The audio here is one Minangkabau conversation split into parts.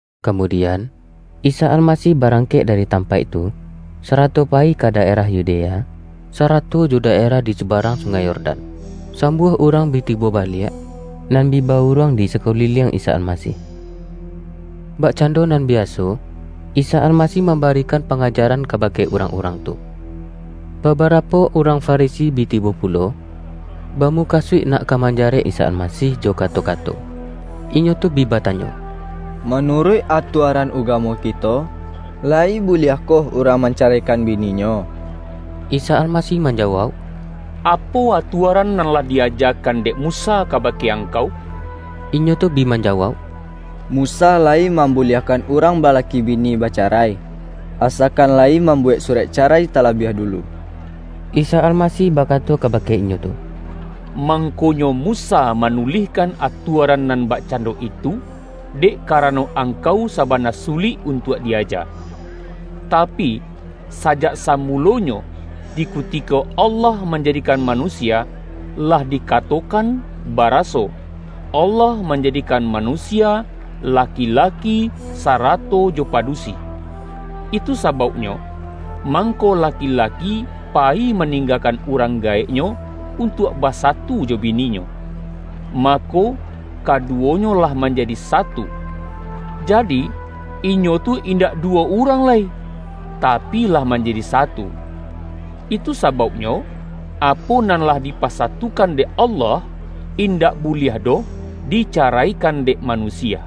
Kamudian, Isa Almasih barang-kek dari tampaik tu, sarato pa-yi ka daerah Yudea, sarato jo daerah di subarang Sungai Yordan. Sambuah urang bi tibo baliak, nan bi ba-uruang di sakuliliang Isa Almasih. Bakcando nan biaso, Isa Almasih mambarikan pangajaran kabake urang-urang tu. Babarapo urang Farisi bi tibo pulo, ba-mukasuik nak ka manjarek Isa Almasih jo kato-kato. Inyo tu bi batanyo,”Manuruik atuaran ugamo kito, layi buliahkoh urang mancaraikan bininyo?” Isa Almasih manjawauk,”Apo atua-ran nan lah di-ajakan dek Musa kaba-ke angkau?” Inyo tu bi manjawauk”Musa layi mam-buliahkan urang balaki bini bacarai, asakan layi mambuwek surek carai talabiah dulu.” Isa Almasih bakato kabake inyo tu,”Mangkonyo Musa manulihkan atuaran nan bakcando itu, dek karano angkau saba-na sulik untuak di-aja. Tapi, sajak samulo-nyo, di kutiko Allah manjadikan manusia, lah dikatokan baraso, ’Allah manjadikan manusia, laki-laki sarato jo padusi. Itu sa-bauknyo, mangko laki-laki payi maning-gakan urang gaeknyo, untuak basatu jo bininyo, mako, kaduwonyo lah manjadi satu.’ Jadi, inyo tu indak duwo urang lai, tapi, lah manjadi satu. Itu sabauknyo, apo nan lah dipasatukan dek Allah, indak buliah doh dicaraikan dek manusia!”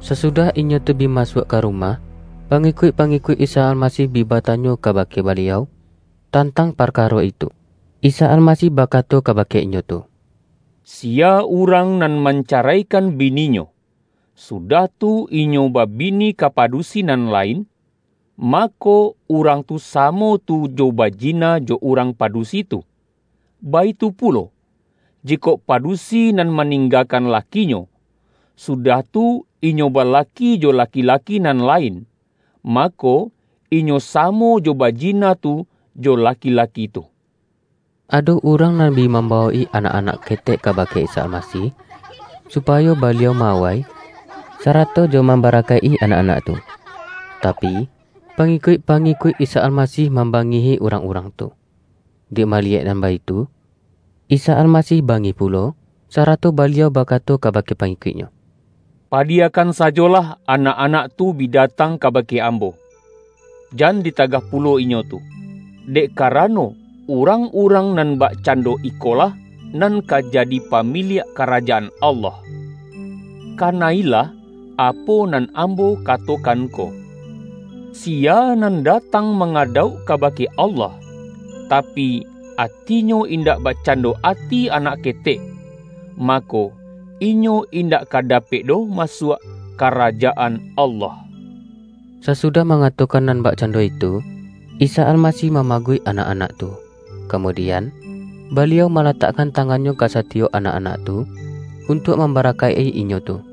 Sasudah inyo tu bi masuak ka ru-mah, pangikuik-pangikuik Isa Almasih bi batanyo kabake Baliau, tantang parka-ro itu. IsaAlmasih bakato, kabake inyo tu,”Siya urang nan mancaraikan bini-nyo, sudah tu inyo babini ka padusi nan lain, mako, urang tu samo tu jo bajina jo urang padusi tu. Baitu pulo, jikok pa-dusi nan maninggakan lakinyo, sudah tu, inyo balaki jo laki-laki nan lain, mako, inyo samo jo bajina tu jo laki-laki tu.” Ado urang nan bi mambawok-i anak-anak ketek kabake Isa Almasih, supayo Baliau ma-awai, sarato jo mam-barakaik-i anak-anak tu. Tapi, pangi-kuik-pangikuik Isa Almasih mamba-ngihi urang-urang tu. Dek maliyek nan baitu, Isa Almasih bangih pulo, sa-rato Baliau bakato kabake pangikuik-Nyo,”Padiyakan sajolah anak-anak tu bi datang kabake Ambo! Jan ditagah pulo inyo tu, dek karano, urang-urang nan bakcando ikolah nan ka jadi pa-miliak Karajaan Allah. Kana-ilah apo nan Ambo katokan ko! Siya nan datang mangadauk kabake Allah, ta-pi, atinyo indak bakcando ati anak ke-tek, mako, inyo indak ka dapek doh masuak Karajaan Allah.” Sasudah mangatokan nan bakcando itu, Isa Almasih mamaguik anak-anak tu, ka-mudian, Baliau malatakkan tangan-Nyo ka satiyok anak-anak tu, untuak mambarakaik-i inyo tu.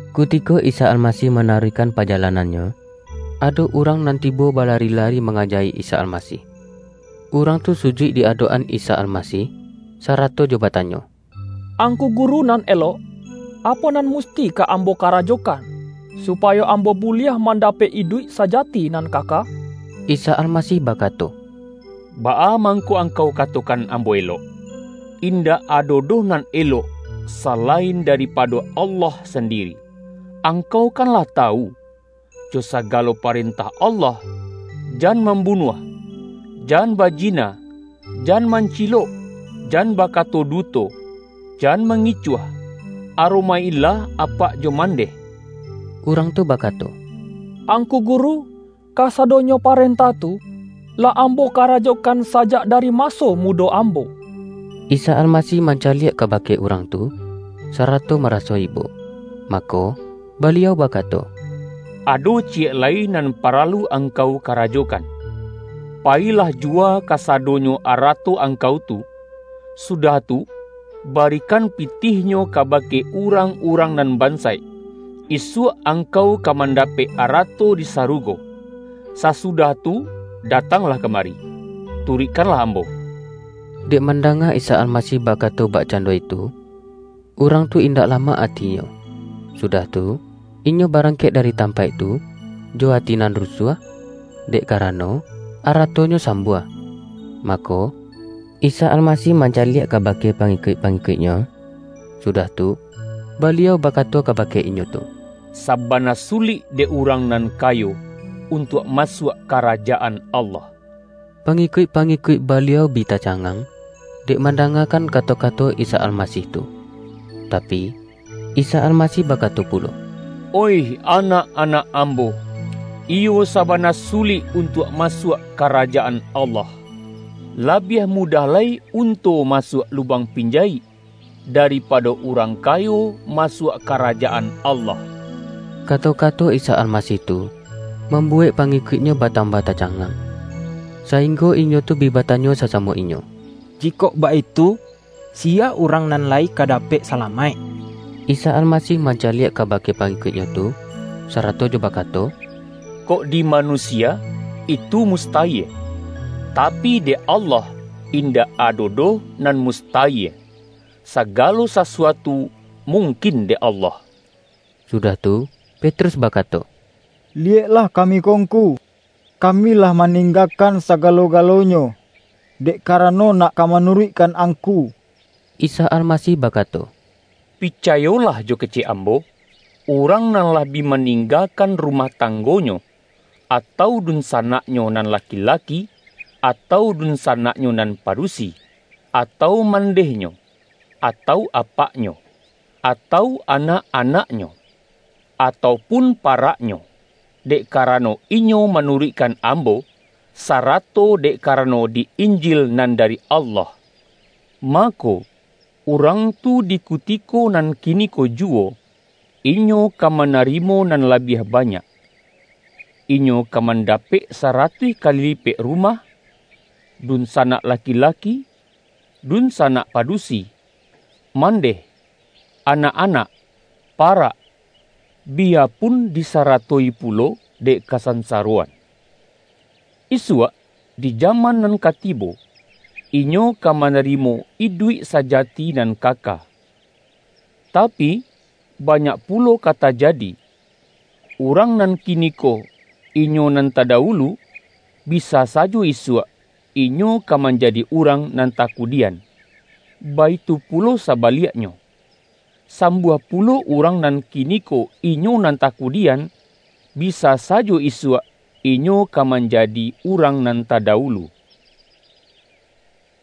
Kutiko Isa Almasih manaruihkan pajalanan-Nyo, ado urang nan tibo ba-lari-lari mangaja-i Isa Almasih. Urang tu sujuik di adok-an Isa Almasih, sara-to jo batanyo,”Angku Guru nan elok, apo nan musti ka ambo karajokan, su-payo ambo buliah mandapek iduik sa-jati nan kaka?” Isa Almasih bakato,”Baa mang-ko angkau katokan Ambo elok? In-dak ado doh nan elok, salain daripa-do Allah sandiri. Angkau kan lah tawu, jo sagalo parentah Allah, ’Jan mambunuah, jan bajina, jan mancilok, jan bakato duto, jan mangicuah, aro-maik-ilah apak jo mandeh.’” Urang tu bakato,”Angku Guru, ka-sadonyo parentah tu, lah ambo karajo-kan sajak dari maso mudo ambo.” Isa Almasih mancaliak kabake urang tu, sarato maraso ibo, mako, Baliau bakato,”Ado ciyek lai nan pa-ralu angkau karajokan. Payilah juwa kasadonyo arato angkau tu; sudah tu, barikan pitihnyo kabake urang-urang nan bansaik, isuak angkau ka manda-pek arato di sarugo. Sasudah tu da-tanglah kamari, turuikkanlah Ambo.” Dek mandanga Isa Almasih bakato bakcando itu, urang tu indak lamak atinyo, sudah tu, inyo barangkek da-ri tampaik tu, jo ati nan rusuah, dek karano, aratonyo sambuah. Mako, Isa Almasih mancaliak ka-bake pangikuik-pangikuik-Nyo, sudah tu, Baliau bakato kabake inyo tu,”Sa-bana sulik dek urang nan kayo, untuak masuak Karajaan Allah!” pangikuik-pangikuik Baliau bi ta-cangang, dek mandangakan kato-ka-to Isa Almasih tu. Tapi, Isa Almasih bakato pulo,”Oih anak-anak Ambo, iyo sabana sulik untuak masuak Ka-rajaan Allah! Labiah mudah lai un-to masuak lubang pinjayik, daripado urang kayo masuak Karajaan Allah.” Kato-kato Isa Almasih tu, mam-buwek pangikuik-Nyo batambah ta-cangang, sainggo inyo tu bi batanyo sasamo inyo,”Jikok baitu, siya urang nan lai ka dapek salamaik?” Isa Almasih mancaliak kabake pa-ngikuik-Nyo tu, sarato jo bakato,”Kok di manusia itu mustayie, tapi, dek Allah indak ado doh nan mustayie; sagalo sasuatu mungkin dek Allah.” Sudah tu, Petrus bakato,”Liyek-lah kami ko Ngku, kami lah maning-gakan sagalo-galonyo, dek karano nak ka manuruikkan Angku.” Isa Almasih bakato,”Picayolah jo kecek Ambo: urang nan lah bi maning-gakan rumah tanggonyo, atau dunsa-naknyo nan laki-laki, atau dunsanak-nyo nan padusi, atau mandehnyo, atau apaknyo, atau anak-anaknyo, atau pun paraknyo, dek karano inyo manuruik-kan Ambo, sarato dek karano di Injil nan dari Allah, mako, urang tu di kutiko nan kiniko juwo, inyo ka ma-narimo nan labiah banyak. Inyo ka mandapek saratuih kali lipek, rumah, dunsanak laki-laki, dunsanak padusi, mandeh, anak-anak, parak, biyapun disaratoi pulo dek kasansaroan. Isuak di jaman nan ka tibo, inyo ka manari-mo iduik sajati nan kaka. Tapi, ba-nyak pulo ka tajadi, urang nan kini-ko inyo nan tadawulu, bisa sajo isuak inyo ka manjadi urang nan takudian, baitu pulo sabaliaknyo, sambuah pulo urang nan kiniko inyo nan takudian, bisa sajo isuak inyo ka manjadi urang nan tadawulu.”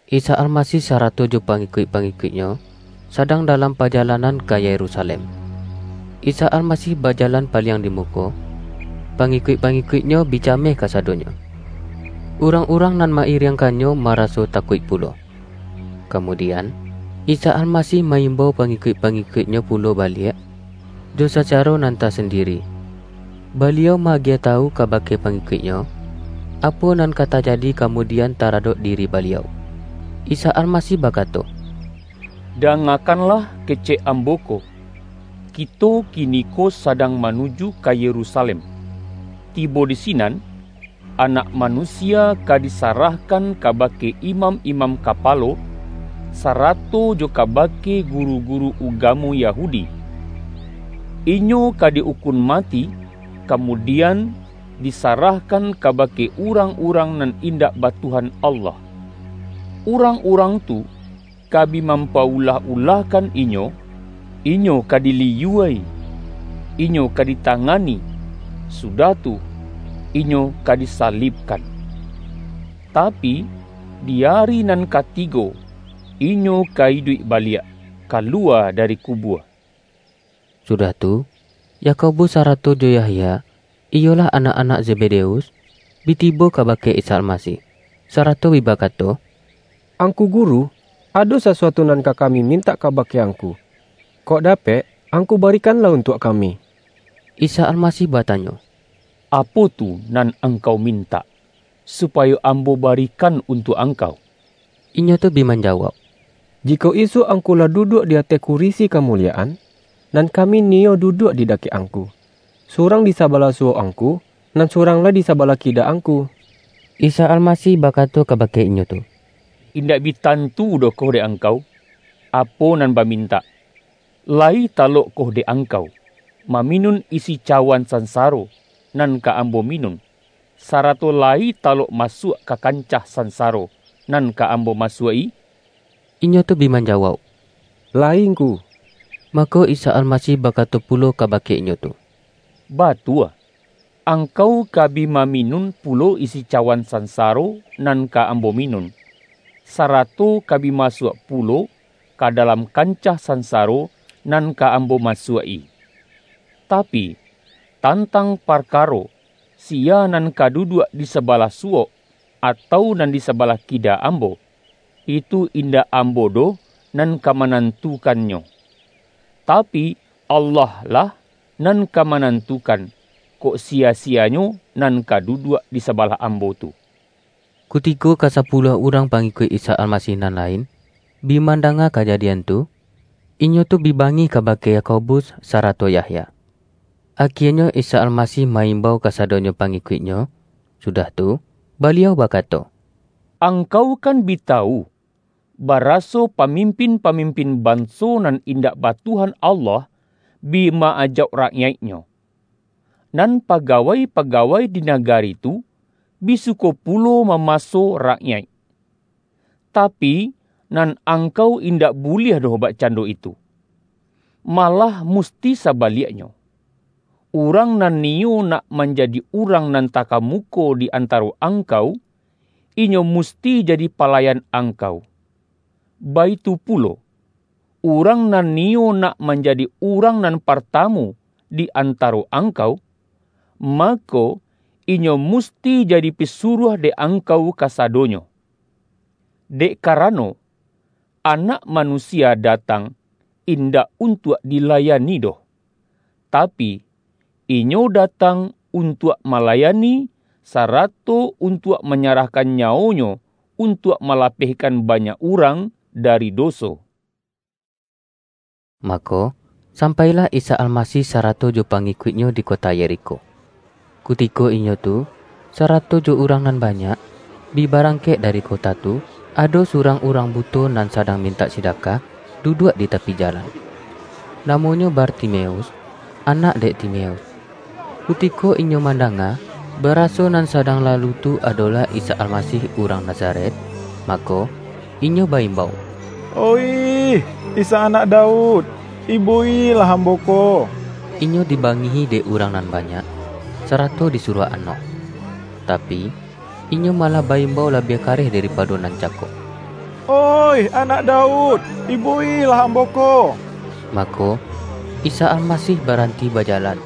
Isa Almasih sarato jo pangikuik-pangikuik-Nyo, sadang dalam pajalan-an ka Yerusalem. Isa Almasih bajalan paliang di muko, pangikuik-pangi-kuik-Nyo bi cameh kasadonyo. Urang-urang nan ma-iriangkan-Nyo maraso takuik pulo. Kamudian, Isa Almasih ma-imbau pangikuik-pangikuik-Nyo pulo baliak, jo sacaro nan tasandiri, Baliau ma-agiah tawu kabake pangi-kuik-Nyo, apo nan ka tajadi kamudi-an taradok diri Baliau. Isa Almasih bakato,”Dangakanlah kecek Ambo ko, kito kiniko sadang manuju ka Yerusa-lem. Tibo di sinan, Anak Manusia ka disarahkan kabake imam-imam kapa-lo, sarato jo kabake guru-guru ugamo Yahudi. Inyo ka di ukun mati, kamu-dian, disarahkan kabake urang-urang nan indak ba Tuhan Allah. Urang-urang tu, ka bi mampa-ulah-ulahkan Inyo, Inyo ka diliyua-i, Inyo ka dita-ngani, sudah tu, Inyo ka disalibkan. Tapi, di ari nan katigo Inyo ka iduik baliak, kaluwa dari kubua.” Sudah tu, Yakobus sarato jo Yah-ya, iyolah anak-anak Zebedeus, bi tibo kabake Isa Almasih, sarato bi bakato,”Angku Guru, ado sasuatu nan ka ka-mi mintak kabake Angku, kok dapek Angku barikanlah untuak kami.” Isa Almasih batanyo,”Apo tu nan angkau mintak, supayo Ambo barikan untuak angkau?” Inyo tu bi manjawauk,”Jikok isuak Angku lah duduak di ateh kurisi ka-muliyaan, nan kami niyo duduak di dakek Angku, surang di sabalah su-wok Angku, nan surang lai di saba-lah kida Angku.” Isa Almasih bakato kabake inyo tu,”Indak bi tantu doh ko dek ang-kau, apo nan bamintak. Layi talokkoh dek angkau, maminun isi cawan san-saro, nan ka Ambo minun, sarato la-yi talok masuak ka kancah sansaro, nan ka Ambo masuak-i?” Inyo tu bi manjawauk,”Layi Ngku.” Mako Isa Almasih bakato pulo kaba-ke inyo tu,”Batua, angkau ka bi ma-minun pulo isi cawan sansaro nan ka Ambo minun, sarato ka bi masuak pulo ka dalam kancah sansaro nan ka Am-bo masuak-i. Tapi, tantang parka-ro siya nan ka duduak di sabalah su-wok, atau nan di sabalah kida Ambo, itu indak Ambo doh nan ka manan-tukannyo. Tapi, Allah-lah nan ka ma-nantukan, kok siya-siyanyo nan ka du-duak di sabalah Ambo tu.” Kutiko kasapuluah urang pangi-kuik Isa Almasih nan lain, bi mandanga kajadian tu, inyo tu bi bangih kabake Yakobus, sarato Yahya. Akienyo Isa Almasih ma-imbau kasadonyo pangi-kuik-Nyo, sudah tu, Baliau bakato,”Ang-kau kan bi tawu, baraso pamimpin-pamimpin banso nan indak ba Tuhan Allah, bi ma-ajauk rakyaiknyo. Nan pa-gawai-pagawai di nagari tu, bi suko pu-lo mamaso rakyaik. Tapi, nan angkau indak buliah doh bakcando itu! Malah musti sabaliaknyo, urang nan niyo nak manjadi urang nan takamuko di antaro angkau, inyo musti jadi palayan ang-kau. Baitu pulo, urang nan niyo nak manjadi urang nan partamu, di antaro angkau, mako, inyo musti jadi pisuruah dek angkau kasadonyo. Dek karano, Anak Manusia datang indak untuak di-layani doh. Tapi, Inyo datang untuak malayani, sarato untuak manyarah-kan nyawo-Nyo, untuak malapehkan banyak urang dari doso.” Mako, sampailah Isa Almasih sa-rato jo pangikuik-Nyo di kota Yerikho. Kutiko inyo tu, sarato jo urang nan ba-nyak, bi barangkek dari kota tu, ado surang urang buto nan sadang mintak sidakah, duduak di tapi jalan. Namonyo Bartimeus, anak dek Timeus. Kuti-ko inyo mandanga, baraso nan sadang lalu tu adolah Isa Almasih urang Na-zaret, mako, inyo ba-imbau,”Oih Isa Anak Daud! Ibo-ilah ambo ko!” Inyo dibangihi dek urang nan ba-nyak, sarato disuruah anok. Tapi, inyo malah ba-imbau labiah kareh daripa-do nan cako,”Oih Anak Daud, ibo-ilah ambo ko!” Mako, Isa Almasih baranti baja-lan,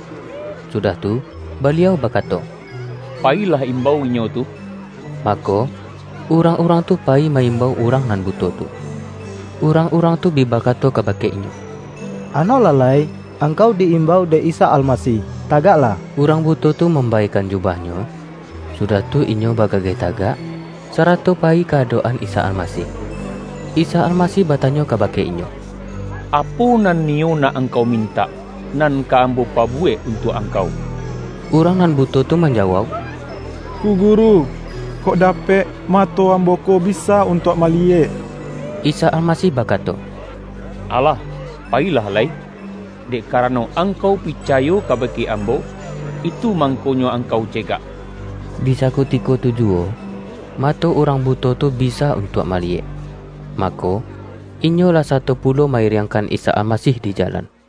sudah tu Baliau bakato,”Payilah imbau inyo tu.” Mako, urang-urang tu payi ma-imbau urang nan buto tu. Urang-urang tu bi ba-kato kabake inyo,”Anoklah lai! Angkau di-imbau dek Isa Almasih, tagaklah!” Urang buto tu mambaekan jubah-nyo, sudah tu inyo bagageh tagak, sa-rato payi ka adok-an Isa Almasih. Isa Almasih batanyo kabake inyo,”Apo nan niyo nak angkau mintak, nan ka Ambo pabuwek untuak angkau?” Urang nan buto tu manjawauk,”Ngku Guru, kok dapek mato ambo ko bisa untuak maliyek.” Isa Almasih bakato,”Alah, pa-yilah lai, dek karano angkau picayo kabake Ambo, itu mangkonyo ang-kau cegak.” Di sakutiko tu juwo, mato urang bu-to tu bisa untuak maliyek. Mako, inyo lah sato pulo ma-iriangkan Isa Almasih di jalan.